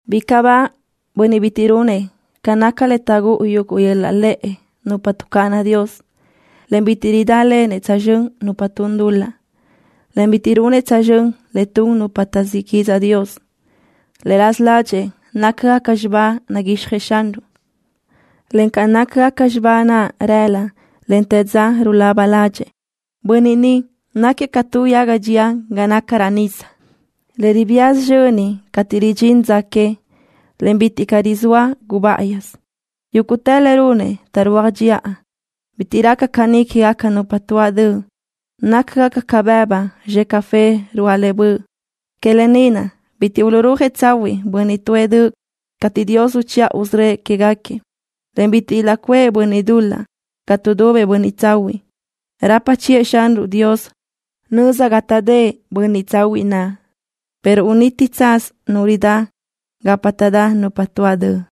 Bicaʼ ba bönniʼ bitiʼ runëʼ ca naca le taʼgúʼu yöl-laʼ lëʼ nupa tuʼcáʼana Dios, en bitiʼ ridálenëʼ tsözxö́n nupa tun dul-laʼ, en bitiʼ runëʼ tsözxö́n le tun nupa taʼzíʼ quidzaʼ Dios. Le raza ládxëʼë nácagaca xibá naguixjëʼ Xanruʼ, en ca nácagaca xibá naʼ rëla, en te dza rulaba ládxëʼë. Bönniʼ ni náquiëʼ ca tu yaga dxeʼ ga naca raʼ nisa, le ribía sizxöni cateʼ ridxín dza que, en bitiʼ caʼ rizóa gubáʼayisö. Yúguʼtë le runëʼ taʼrúaj dxiʼa. Bitiʼ raca caní quégaca nupa tuáʼ döʼ. Nácagaca ca bëbu zxe café ruáʼ le böʼ. Que lë ni naʼ bitiʼ uluʼrúajëʼ tsahuiʼ bönniʼ tuʼë döʼ cateʼ Dios uchiʼa usörö́ëʼ quégaquiëʼ, en bitiʼ ilaʼcuʼë bönniʼ dul-laʼ ga tuʼdubëʼ bönniʼ tsahuiʼ. Rapa chiʼë Xanruʼ Dios nöza ga taʼdë́ʼ bönniʼ tsahuiʼ naʼ, pero uniti tsaz nu ridá gapa taʼdá nupa tuáʼ döʼ.